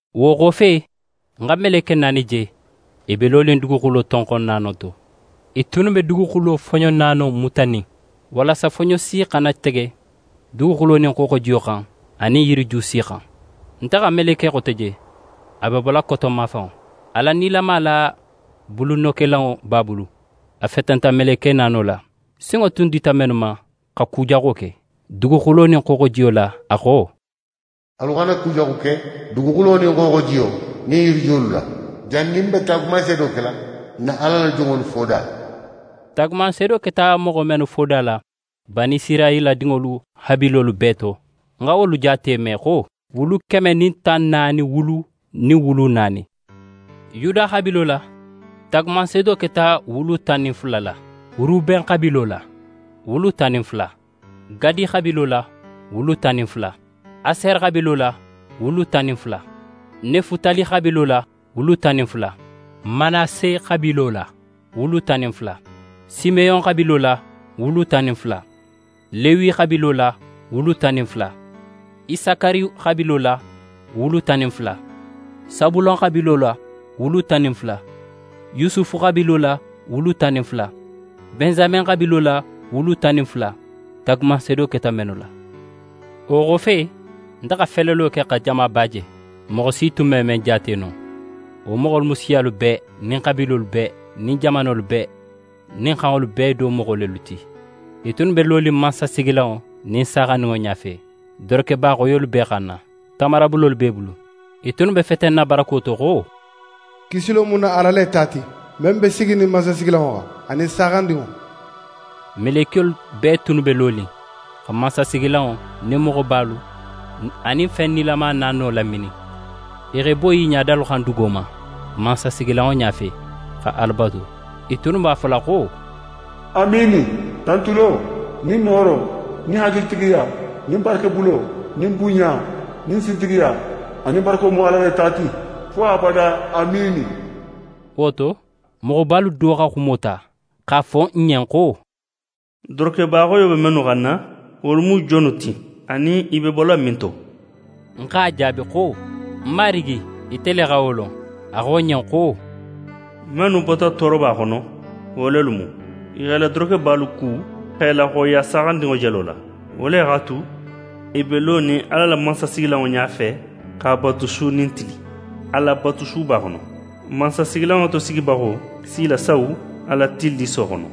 Wo xofe, ń xa meleke naani je, i be lonin duguxulo tonxon naano to. I tunnu be duguxulo foɲo naano mutanin, walasa foɲo si xana tege duguxulo nin xooxojiyo xan anin yiriju si xan. Nte xa meleke xote je, a be bola koton mafanŋo, Ala nilama la bulunokelanŋo b'a bulu. A fetenta meleke naano la, sinŋo tun dita mennu ma xa ku jaxo ke duguxulo nin xooxojiyo la, a xo: «Alu xana kujaxu ke duguxulo nin xooxojiyo nin yirijuwolu la, jannin n be taagumanseedo kela n na Ala la jonŋolu foda la.» Taagumanseedo keta moxo mennu foda la Banisirayila dinŋolu xabiilolu bee to, ń xa wolu jaate me xo: Wulu keme nin tan naani wulu nin wulu naani. Yuda xabiilo la, taagumanseedo keta wulu tan nin fula la; Ruben xabiilo la, wulu tan nin fula; Gadi xabiilo la, wulu tan nin fula; Asere xabiilo la, wulu tan nin fula; Nefutali xabiilo la, wulu tan nin fula; Manase xabiilo la, wulu tan nin fula; Simeyon xabiilo la, wulu tan nin fula; Lewi xabiilo la, wulu tan nin fula; Isakari xabiilo la, wulu tan nin fula; Sabulon xabiilo la, wulu tan nin fula; Yusufu xabiilo la, wulu tan nin fula; Bensamen xabiilo la, wulu tan nin fula, taagumanseedo keta mennu la. Wo xofe, nte xa felelo ke xa jamaba je, moxo si tun me men jaate no. Wo moxolu mu siyalu bee nin xabiilolu bee nin jamanolu bee nin xanŋolu bee do moxo lelu ti. I tunnu be lonin mansasigilanŋo nin Saaxandinŋo ɲafe, dorokeba xoyolu b'e xanna, tamarabulolu b'e bulu. I tunnu be fetenna barako to xo: «Kisilo mu n na Ala le ta ti, men be siginin mansasigilanŋo xan, anin Saaxandinŋo!» Melekiyolu bee tunnu be lonin xa mansasigilanŋo nin moxobalu anin fen nilama naano laminin. I x'e boyi i ɲadalu xan dugo ma, mansasigilanŋo ɲafe, xa Ala batu. I tunnu b'a fola xo: «Amiini! Tantulo nin nooro nin hakilitigiya nin barakebulo nin bunɲa nin sintigiya anin barako mu n na Ala le ta ti, fo abada! Amiini!» Wo to, moxobalu do xa xumo ta x'a fo ń ɲen xo: «Dorokeba xoyo be mennu xanna, wolu mu jonnu ti, anin i be bola minto?» Ń x'a jaabi xo: «Ń Marigi, ite le xa wo lon.» A xo ń ɲen xo: «Mennu bota tooroba xono, wo lelu mu. I x'e la dorokebalu ku x'e laxoyiya Saaxandinŋo jelo la. Wo le x'a tu, i be lonin Ala la mansasigilanŋo ɲafe x'a batu su nin tili, a la batusuba xono. Mansasigilanŋo tosigibaxo si i lasawu a la tilliso xono.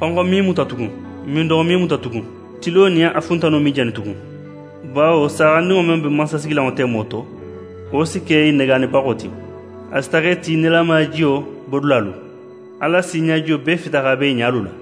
Xonxo me i muta tugun, mindoxo me i muta tugun, tilo nin a funtano me i jani tugun, bawo Saaxandinŋo men be mansasigilanŋo temo to, wo si ke i negaanibaxo ti, a si taxa i ti nilamaya jiyo bodulalu. Ala si ɲajiyo bee fita x'a bo i ɲalu la.»